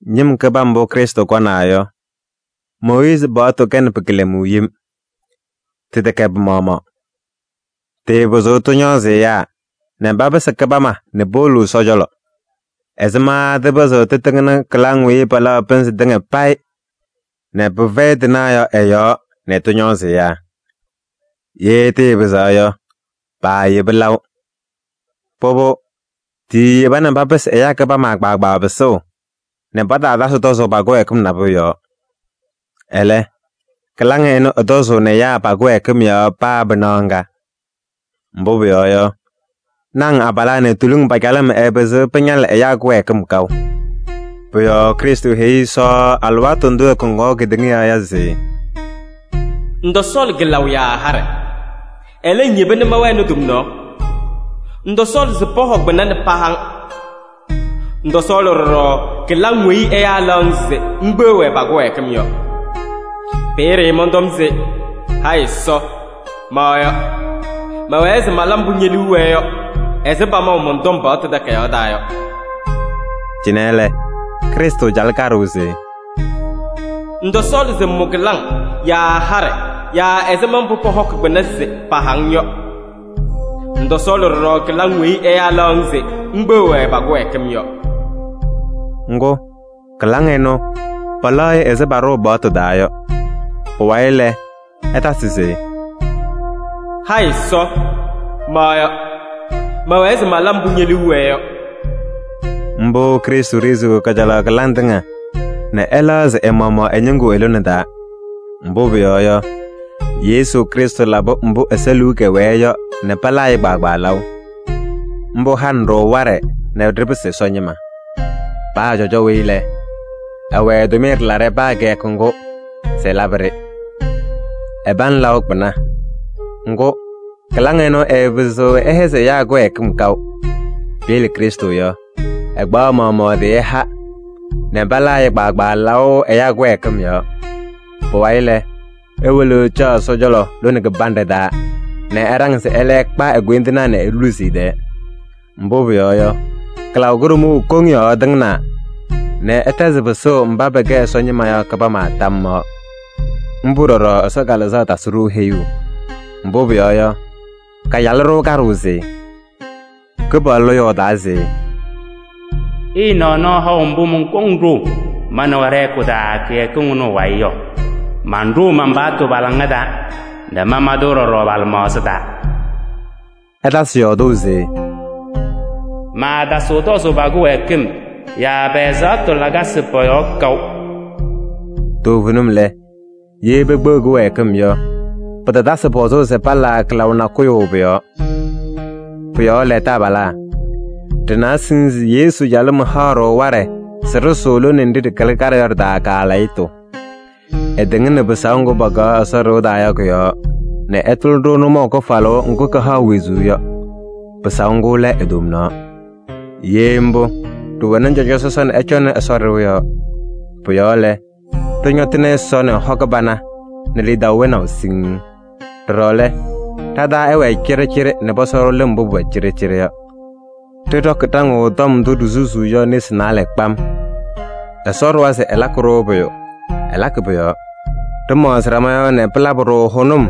Ñɩm kɩbam mbʋ Krɩstʋ kɔnaa yɔ, Mooyiizi paɣtʋ kɛnɩ pɩ-kɩlɛmʋʋ yem. Tɩtɛkɛ pɩ-maɣmaɣ. Tɩɩpɩzɩɣ tɩñɔɔzɩ ɛyaa nɛ papɩsɩ kɩbama nɛ powolo Ɛsɔ cɔlɔ: ɛzɩma tɩpɩzɩɣ tɩtɩŋnɩ kɩlaŋ weyi palaɣ pɩnzɩ tɩŋa payɩ nɛ pɩfɛyɩ tɩnaɣ yɔ ɩ-yɔɔ nɛ tɩñɔɔzɩ ɛyaa? Ye tɩɩpɩzaɣ yɔ, paayeba laʋ. Pʋbʋ, tiiyeba nɛ papɩsɩ ɛyaa kɩbama kpaagbaa pɩsʋʋ nɛ pataatasɩ tɔzʋʋ pa-kɩwɛɛkɩm nabʋyʋ yɔɔ. Ɛlɛ, kɩlaŋ ɩnʋ ɩtɔzʋʋnɩ ɛyaa pa-kɩwɛɛkɩm yɔɔ paa pɩnaɣ ŋga. Mbʋ pʋyɔɔ yɔ, naŋ abalaa nɛ tuluŋ pa-calɩm ɛɛpɩzɩɣ pɩñalɩ ɛyaa kɩwɛɛkɩm kaʋ. Pʋ-yɔɔ Krɩstʋ heyi Ɛsɔ alɩwaatʋ ndʋ ɛkɔŋaɣ kedeŋa yɔɔ yɔ se: “Ŋtɔsɔɔlɩ kɩlaʋ yaa haɖɛ. Ɛlɛ, ŋyeba nɛ mɛwɛnɩ tomnaɣ. Ŋtɔsɔɔlɩ se pɔhɔ kpɩna nɛ paha-ŋ. Ŋtɔsɔɔlɩ ɖɔɖɔ kɩlaŋ weyi ɛyaa laɣ-ŋ se ŋkpeɣ-wɛ pa-kɩwɛɛkɩm yɔ. Peeye mɔntɔm se: ‘Hayɩ Ɛsɔ! Ma yɔ: mɛwɛɛ se mala mbʋ ñe-liu wɛɛ yɔ ɛzɩ pamaʋ mɔn-tɔm paɣtʋ takayaɣ taa yɔ.’” Cɩnɛ lɛ, Krɩstʋ calɩ kaɖʋʋ se: “Ŋtɔsɔɔlɩ se ŋmʋ kɩlaŋ yaa haɖɛ yaa ɛzɩma mbʋ pɔhɔkɩ kpɩna se paha-ŋ yɔ. Ŋtɔsɔɔlɩ ɖɔɖɔ kɩlaŋ weyi ɛyaa laɣ-ŋ se ŋkpeɣ-wɛ pa-kɩwɛɛkɩm yɔ.” Ŋgʋ, kɩlaŋ ɩnʋ palaɣ-ɩ ɛzɩ paɖʋʋ paɣtʋ taa yɔ. Pʋwayɩ lɛ, ɛtasɩ se: “Hayɩ Ɛsɔ! Ma yɔ: mɛwɛɛ se mala mbʋ ñe-liu wɛɛ yɔ.” Mbʋ Krɩstʋ ɖeziɣ kajalaɣ kɩlaŋ tɩŋa nɛ ɛlɛɣzɩ ɛ-maɣmaɣ ɛ-ñɩŋgʋ i-lone taa. Mbʋ pʋyɔɔ yɔ, Yesu Krɩstʋ labɩ mbʋ Ɛsɔ liu kɛwɛɛ yɔ nɛ palaa-ɩ kpaagbaa laʋ. Mbʋ hanɩ-ɖʋ waɖɛ nɛ ɖɩpɩsɩ Ɛsɔ ñɩma. Paa cɔjɔ weyi lɛ, ɛwɛ ɛ-tʋmɩyɛ ɖɩlaɖɛ paa kɩyakʋ ŋgʋ se ɛlabɩ-ɖɩ. Ɛpaŋ laʋ kpɩna, ŋgʋ, kɩlaŋ ɩnʋ ɩɩpɩzɩɣ ɩhɛzɩ ɛyaa kɩwɛɛkɩm kaʋ. Piyele Krɩstʋ yɔ, ɛkpaɣ ɛ-maɣmaɣ ɛ-tɩ ɛha nɛ palaa-ɩ kpaagbaa laʋ ɛyaa kɩwɛɛkɩm yɔɔ. Pʋwayɩ lɛ, ewolo ɛcaɣ Ɛsɔ cɔlɔ lone kɩbanɖɛ taa nɛ ɛɖaŋ se ɛlɛ ɛkpa e-koyindinaa nɛ eluzi ɛ-tɛɛ. Mbʋ pʋyɔɔ yɔ, kɩlaʋ kʋɖʋmʋʋ koŋ yɔɔ ɛtɩŋnaa nɛ ɛtɛzɩ pɩsʋʋ mba pɛkɛ Ɛsɔ ñɩma yɔ kɩbama tam yɔɔ. Mbʋ ɖɔɖɔ Ɛsɔ Kalɩzaɣ tasɩ-ɖʋ heyuu. Mbʋ pʋyɔɔ yɔ, kacalɩ-ɖʋ kaɖʋʋ se: “Kɩpaɣlʋ yɔɔdaa se: ‘Ɩɩnaɣ nɔɔ haʋ mbʋ mɔnkɔŋ ɖʋʋ ma nɛ wɛ ɖɛ-hɛkʋ taa kɩyakɩŋ ɩnʋ ɩ-wayɩ yɔ. Manɖʋʋ man-paɣtʋ pa-laŋa taa nɛ mama-tʋ ɖɔɖɔ pa-lɩmaɣza taa.’” Ɛtasɩ yɔɔdʋʋ se: “Maatasɩɣ tɔzʋʋ pa-kɩwɛɛkɩm yaa pɛ-ɛzaɣtʋ lakasɩ pɔ-yɔɔ kaʋ.” Toovenim lɛ, ye pekpeɣ kɩwɛɛkɩm yɔ, pɩtatasɩ pɔzʋʋ se palaa kɩlaʋ nakʋyʋ pʋ-yɔɔ. Pʋ-yɔɔ lɛ, taabalaa! Ɖɩna siŋŋ se Yesu calɩm haɣ-ɖʋ waɖɛ se ɖɩsʋʋ lone nɖɩ ɖɩkɩlɩ kaɖɛ yɔ ɖɩ-taa kaalɛyɩtʋ. Ɛtɩŋnɩ pɩsaʋ ŋgʋ pakaɣ Ɛsɔ ɖɩɣa taa yɔ kʋ-yɔɔ nɛ ɛtʋlɩ-ɖʋ nʋmɔʋ kɩfalʋʋ ŋgʋ kɩhaɣ wezuu yɔ. Pɩsaʋ ŋgʋ lɛ e-tomnaɣ. Ye mbʋ, ɖɩwɛnɩ cɔjɔ sɔsɔ nɛ ɛcɔŋnɩ Ɛsɔ ɖɩɣa yɔɔ. Pʋ-yɔɔ lɛ, ɖɩñɔtɩnɩ Ɛsɔ nɛ hɔ kɩbana nɛ lidaʋ wɛnaʋ siŋŋ. Ɖɔɖɔ lɛ, ɖa-taa ɛwɛɛ cɩɖɩcɩɖɩ nɛ pɔsɔ-ɖʋ lɩm mbʋ pʋwɛ cɩɖɩcɩɖɩ yɔ. Ɖɩɖɔkɩ ɖaŋʋʋ tɔm ndʋ ɖisusuu yɔ nesi naalɛ kpam. Ɛsɔ ɖʋwa se ɛlakɩ-ɖʋ pʋyʋ, ɛlakɩ pʋ-yɔɔ. Ɖɩmaɣzɩ ɖama yɔɔ nɛ pɩlabɩ-ɖʋ hʋnʋm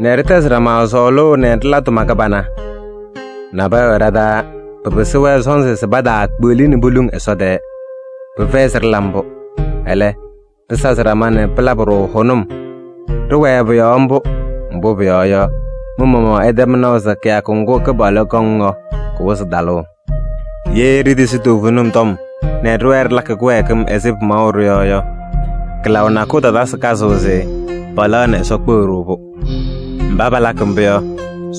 nɛ ɖɩtɛzɩ ɖama sɔɔlʋʋ nɛ ɖɩla tʋma kɩbana. Nabɛyɛ wɛ ɖa-taa, pɩpɩsɩ-wɛ sɔnzɩ se pataakpeɣli nɛ poluŋ Ɛsɔ tɛɛ. Pɩfɛyɩ se ɖɩla mbʋ. Ɛlɛ, ɖɩsazɩ ɖama nɛ pɩlabɩ-ɖʋ hʋnʋm. Ɖɩwɛɛ pʋ-yɔɔ mbʋ, mbʋ pʋyɔɔ yɔ, mɩ-maɣmaɣ ɩtɛm naʋ se kɩyakʋ ŋgʋ Kɩpaɣlʋ kɔŋ yɔ, kɩwɩzɩ talʋʋ. Ye ɖitisi toovenim tɔm nɛ ɖɩwɛɛ ɖɩlakɩ kɩwɛɛkɩm ɛzɩ pɩmaɣʋ-ɖʋ yɔ yɔ, kɩlaʋ nakʋyʋ tatasɩ kazʋʋ se palaɣ nɛ Ɛsɔ kpeɣ-ɖʋ-pʋ. Mba palakɩ mbʋ yɔ,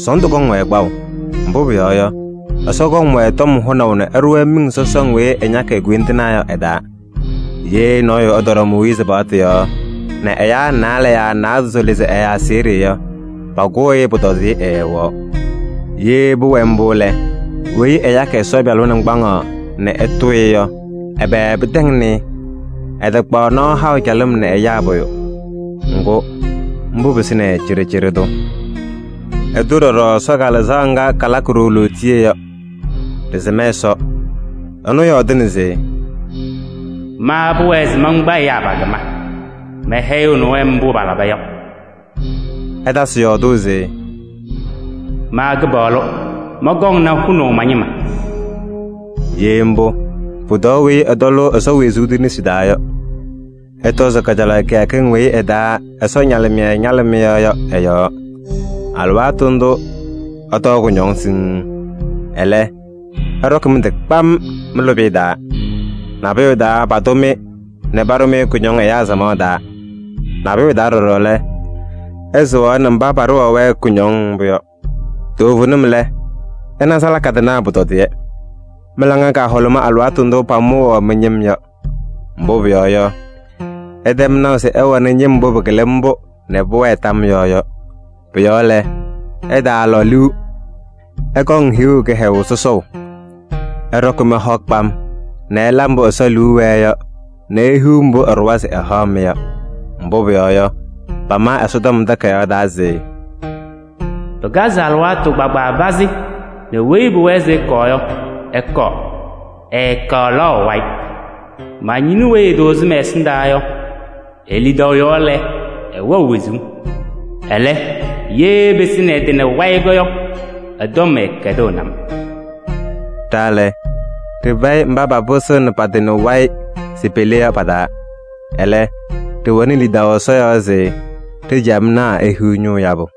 sɔɔndʋ kɔŋ-wɛ kpaʋ. Mbʋ pʋyɔɔ yɔ, Ɛsɔ kɔŋ-wɛ tɔm hʋnaʋ nɛ ɛɖʋ-wɛ miŋ sɔsɔŋ weyi ɛñakɩ e-koyindinaa yɔ ɛ-taa. Ye nɔɔyʋ ɛtɔɖɔ Mooyiizi paɣtʋ yɔɔ nɛ ɛyaa naalɛ yaa naadozo lɩzɩ ɛ-aseɣɖe yɔ, pakʋʋ-ɩ, pʋtɔdɩyɛ ɛɛwɛɣ. Ye pʋwɛ mbʋ lɛ, weyi ɛyakɩ Ɛsɔ Pɩyalʋ naŋgbaŋaɣ nɛ ɛtʋʋ-ɩ yɔ, ɛbɛ pɩtɛŋnɩ-ɩ? Ɛtakpaɣ nɔɔ haʋ calɩm nɛ ɛyaa pʋyʋ. Ŋgʋ, mbʋ pɩsɩnɩ-ɩ cɩɖɩcɩɖɩ tʋ. Ɛtʋ ɖɔɖɔ Ɛsɔ Kalɩzaɣ ŋga kalakɩ-ɖʋ lootiye yɔ. Ɖɩsɩm Ɛsɔ, ɛnʋ yɔɔdɩna se: “Ma pʋwɛɛ se mankpa ɛyaa pa-kɩma. Mɛhɛyɩɣnɩ-wɛ mbʋ palaba yɔ.” Ɛtasɩ yɔɔdʋʋ se: “Ma Kɩpaɣlʋ mɔnkɔŋnɩ hʋnaʋ ma-ñɩma.” Ye mbʋ, pʋtɔɔ weyi ɛtɔlʋʋ Ɛsɔ wezuu tʋ nesi taa yɔ! Ɩtɔzɩ kajalaɣ kɩyakɩŋ weyi ɩ-taa Ɛsɔ ñalɩmɩyɛ ñalɩ mɩ-yɔɔ yɔ ɩ-yɔɔ. Alɩwaatʋ ndʋʋ ɩtɔɔ kʋñɔŋ siŋŋ. Ɛlɛ, ɩɖɔkɩ mɩ-tɩ kpam mɩ-lʋbɩyɛ taa. Nabʋyʋ taa, patʋ-mɩ nɛ paɖʋ-mɩ kʋñɔŋ ɛyaa samaɣ taa. Nabʋyʋ taa ɖɔɖɔ lɛ, ɩsɩŋaɣnɩ mba paɖʋwaɣ-wɛ kʋñɔŋ mbʋ yɔ. Toovenim lɛ, ɩna salaka tɩnaa pʋtɔdɩyɛ. Mɩ-laŋa kahʋlʋmɩ alɩwaatʋ ndʋ pamʋwaɣ mɩ-ñɩm yɔ. Mbʋ pʋyɔɔ yɔ, ɩtɛm naʋ se ɩwɛnɩ ñɩm mbʋ pɩkɩlɩ mbʋ nɛ pʋwɛɛ tam yɔɔ yɔ. Pʋ-yɔɔ lɛ, ɩtaalɔ liu: ɩkɔŋ hiɣu kɩhɛyʋʋ sɔsɔʋ. Ɩɖɔkɩ mɩ-hɔ kpam nɛ ɩla mbʋ Ɛsɔ liu wɛɛ yɔ nɛ ihiɣ mbʋ ɛɖʋwa se ɛhaɣ-mɩ yɔ. Mbʋ pʋyɔɔ yɔ, pama Ɛsɔtɔm Takayaɣ taa se: “Pɩkazɩ alɩwaatʋ kpaagbaa pazɩ nɛ weyi pʋwɛɛ se ɛkɔɔ yɔ, ɛkɔɔ. Ɛtalaɣ wayɩ. Ma-ñɩnʋ weyi ɛtʋʋzɩ mɛ-ɛsɩndaa yɔ, e-lidaʋ yɔɔ lɛ, ɛwɛɣ wezuu. Ɛlɛ, ye ɛpɩsɩnɩ ɛ-tɩ nɛ wayɩ yɔ, ɛ-tɔm ɛɛkɛdɩɣnɩ-m.” Ɖa lɛ, ɖɩfɛyɩ mba papɩsɩɣnɩ pa-tɩ nɛ wayɩ se pele yɔ pa-taa. Ɛlɛ, ɖɩwɛnɩ lidaʋ Ɛsɔ yɔɔ se ɖa-ciyamnaa ehiɣ ñʋʋ yabʋ.